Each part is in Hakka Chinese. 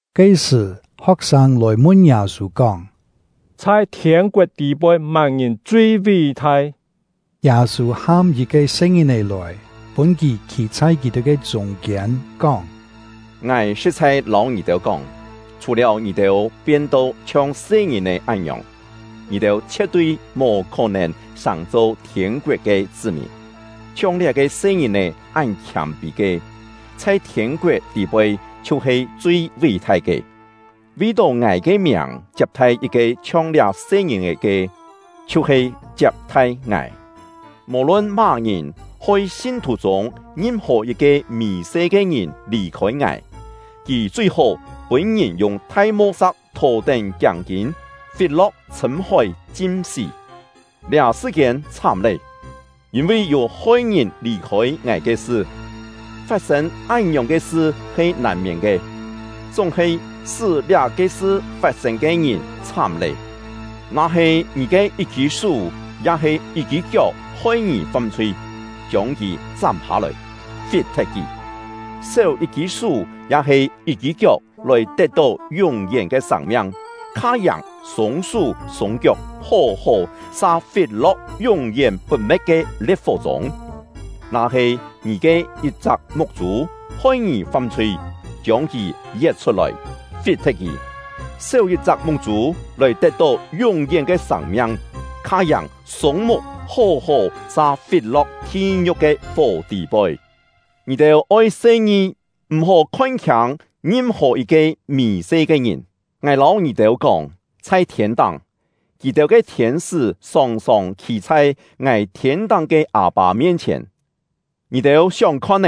Ke-sṳ̀, ho̍k-sâng lòi mun Yâ-sû kóng: “Chhai thiên-koet tî-poi má-ngìn chui ví-thai?” Yâ-sû ham yit-ke se-ngìn-è lòi, pûn kì khî chhai kì-têu ke chûng-kiên, kóng: “Ngài sṳ̍t-chhai lâu ngì-têu kóng, chhù-liáu ngì-têu pien-to chhiong se-ngìn-è án-ngiòng, ngì-têu chhie̍t-tui mò khó-nèn sàng-cho thiên-koet ke chṳ́-mìn. Chhiong liá-ke se-ngìn-è án khiâm-pî ke, chhai thiên-koet tî-poi chhiu-he chui ví-thai ke. Vi-tó ngài ke miàng chiap-thai yit-ke chhiong liá se-ngìn-è ke, chhiu-he chiap-thai ngài. “Mò-lun má-ngìn hoi sin-thù chûng ngim-hò yit-ke mì-se ke ngìn lì-khôi ngài, kì chui-hó pûn-ngìn yung thai mo-sa̍k thò-tén kiáng-kîn, fit-lo̍k chhṳ̂m-hói chim-sí. Liá sṳ-kiên chhám lé, yîn-vi yû hoi-ngìn lì-khôi ngài ke sṳ! Fat-sên án-ngiòng ke sṳ he nàn-miên ke, chúng-he sṳ́ liá-ke sṳ fat-sên ke ngìn chhám lé! “Na-he ngì ke yit-kî sú ya-he yit-kî kiok hoi ngì fam-chhui, chiông kì chám hâ-lòi, fit-thet kì. Séu yit-kî sú ya-he yit-kî kiok lòi tet-tó yún-yén ke sâng-miang, kha-yàng sûng-sú sûng-kiok hó-hó sa fit-lo̍k yún-yén put-me̍t ke lie̍t-fó chûng. Na-he ngì ke yit-chak muk-chû hoi ngì fam-chhui, chiông kì yet chhut-lòi, fit-thet kì. Séu yit-chak muk-chû lòi tet-tó yún-yén ke sâng-miang, kha-yàng sûng-muk hó-hó sa fit-lo̍k thi-ngiu̍k ke fó tî-poi. “Ngì-têu oi se-ngi, m̀-hó khon-khiâng ngim-hò yit-ke mì-se ke ngìn. Ngài lâu ngì-têu kóng, chhai thiên-táng, kì-têu ke thiên-sṳ́ sòng-sòng khî chhai ngài thiên-táng ke Â-pâ mien-chhièn. Yû-têu kú-kién kâ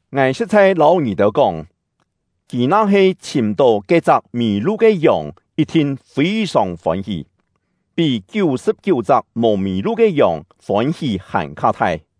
Ngài sṳ̍t-chhai lâu ngì-têu kóng, kì na-he chhìm-tó ke-chak mì-lu ke yòng yit-thin fî-sòng fôn-hí, pí kiú-sṳ̍p-kiú-chak mò mì-lu ke yòng fôn-hí hàn-kha thai!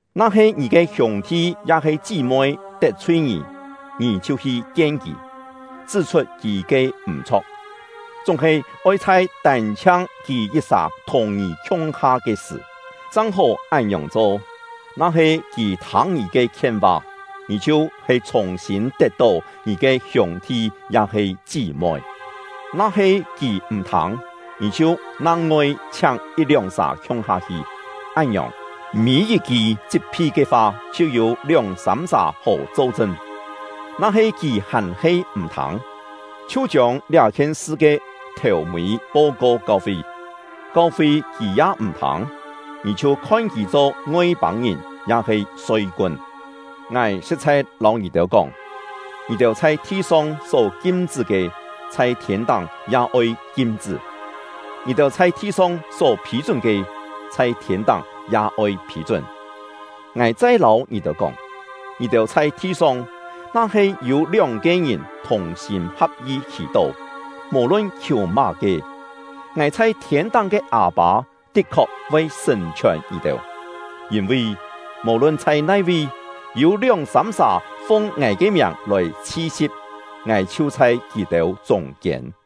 “Na-he ngì ke hiûng-thi ya-he chí-moi tet-chhui ngì “tet-chhui ngì” nang-ngoi yû-têu kú-kién he “fam-chhui”., ngì chhiu hi kien kì, chṳ́-chhut kì ke m̀-chho̍k; chúng-he oi chhai tân-chhiang kì yit-sà thùng ngì khiung-ha ke sṳ̀ chang-hó án-ngiòng cho. Na-he kì thâng ngì ke khien-va, ngì chhiu-he chhùng-sîn tet-tó ngì ke hiûng-thi ya-he chí-moi. Na-he kì m̀-thâng, ngì chhiu nang-ngoi chhiáng yit-lióng sà khiung-ha hi; án-ngiòng, mî-yit-ki chit-phi ke fa chhiu yû lióng-sâm sà hó cho-chṳn. Na-he kì hàn-he m̀-thâng, chhiu chiông liá-khien sṳ ke thèu-mî po-ko kau-fi. Kau-fi kì ya m̀-thâng, ngì chhiu khon kì cho Ngoi-pâng-ngìn ya-he soi-kun. “Ngài sṳ̍t-chhai lâu ngì-têu kóng, ngì-têu chhai thi-song só kim-chṳ́ ke, chhai thiên-táng ya oi kim-chṳ́; ngì-têu chhai thi-song só phî-chún ke, chhai thiên-táng ya oi phî-chún. “Ngài chai lâu ngì-têu kóng, ngì-têu chhai thi-song, na-he yû lióng-ke ngìn thùng-sîm ha̍p-yi khì-tó, mò-lun khiù má-ke, ngài chhai thiên-táng ke Â-pâ tit-khok voi sṳ̀n-chhiòn ngì-têu. Yîn-vi, mò-lun chhai nai-vi, yû lióng-sâm sà fung ngài ke miàng lòi chhi-si̍p, ngài chhiu chhai kì-têu chûng-kiên.”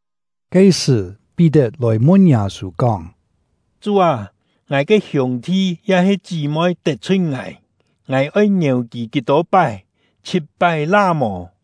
Ke-sṳ̀, Pí-tet lòi mun Yâ-sû kóng: “Chú â, ngài ke hiûng-thi ya-he chí-moi tet-chhui ngài, ngài oi ngièu kì kí-tô pái? Chhit-pái la mò?”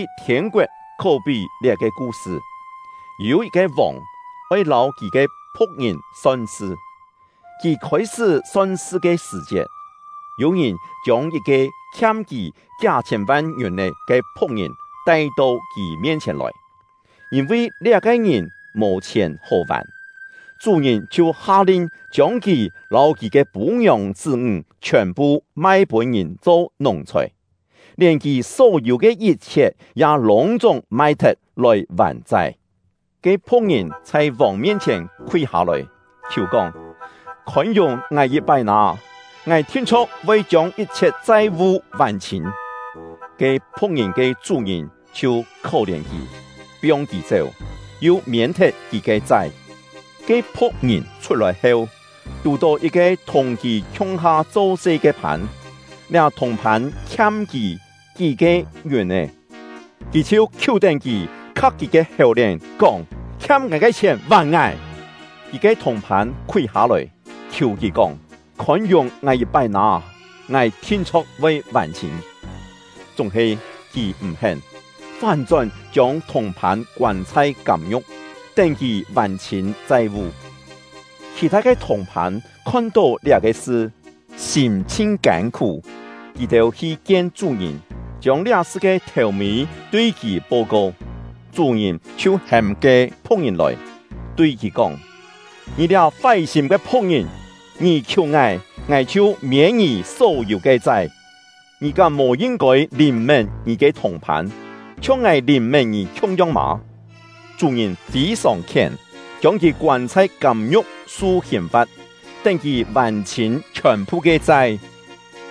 Yîn-vi thiên-koet khó-pí liá-ke ku-sṳ: Yû yit-ke vòng oi lâu kì ke phu̍k-ngìn son-sṳ. Kì khôi-sṳ́ son-sṳ ke sṳ̀-chiet, yû-ngìn chiông yit-ke khiam kì kí-hâ chhiên-van ngiùn-è ke phu̍k-ngìn tai-to kì mien-chhièn lòi. Yîn-vi liá-ke ngìn mò-chhièn hó-vàn, chú-ngìn chhiu ha-lin chiông kì lâu kì ke pû-ngiòng chṳ́-ńg chhiòn-phu mai-pûn ngìn cho nùng-chhòi, lièn kì só-yû ke yit-chhiet ya lûng-chúng mai-thet lòi vàn-chai. Ke phu̍k-ngìn chhai vòng mien-chhièn khúi hâ-lòi, khiù kóng: ‘Khôn-yùng ngài yit-pái nâ! Ngài thin-chho̍k voi chiông yit-chhiet chai-vu vàn-chhîn.’ Ke phu̍k-ngìn ke chú-ngìn chhiu khó-lièn kì, piong kì chéu, yu miên-thet kì ke chai. “Ke phu̍k-ngìn chhut-lòi heu, tù-tó yit-ke thùng kì khiung-ha cho-se ke phân. Liá thùng-phân khiam kì kí-ke ngiùn-è, kì chhiu khiú-tén kì, kha̍k kì ke hèu-lièn, kóng: ‘Khiam ngài ke chhièn vàn ngài!’ Kì ke thùng-phân khúi hâ-lòi, khiù kì kóng: ‘Khôn-yùng ngài yit-pái nâ! Ngài thin-chho̍k voi vàn-chhîn!’ Chúng-he kì m̀-hén, fán-chón chiông thùng-phân koân chhai kâm-ngiu̍k, tén kì vàn-chhîn chai-vu. Khì-thâ ke thùng-phân khon-tó liá-ke sṳ, sîm chhin kân-khú; kì-têu hi kien chú-ngìn, chiông liá-sṳ ke thèu-mî tui kì po-ko. Chú-ngìn chhiu hêm ke phu̍k-ngìn lòi, tui kì kóng: ‘Ngì liá fái-sîm ke phu̍k-ngìn! Ngì khiù ngài, ngài chhiu miên ngì só-yû ke chai, ngì kám mò yin-kôi lìn-mén ngì ke thùng-phân, chhiong ngài lìn-mén ngì khiung-yong mâ?’ Chú-ngìn fî-sòng khién, chiông kì koân chhai kâm-ngiu̍k su hìn-fa̍t, tén kì vàn-chhîn chhiòn-phu ke chai.”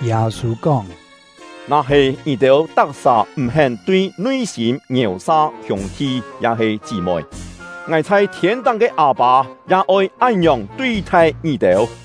Yâ-sû kóng: “Na-he ngì-têu tak-sà m̀-hén tui nui-sîm ngièu-sa hiûng-thi ya-he chí-moi, ngài chhai thiên-táng ke Â-pâ ya oi án-ngiòng tui-thai ngì-têu.”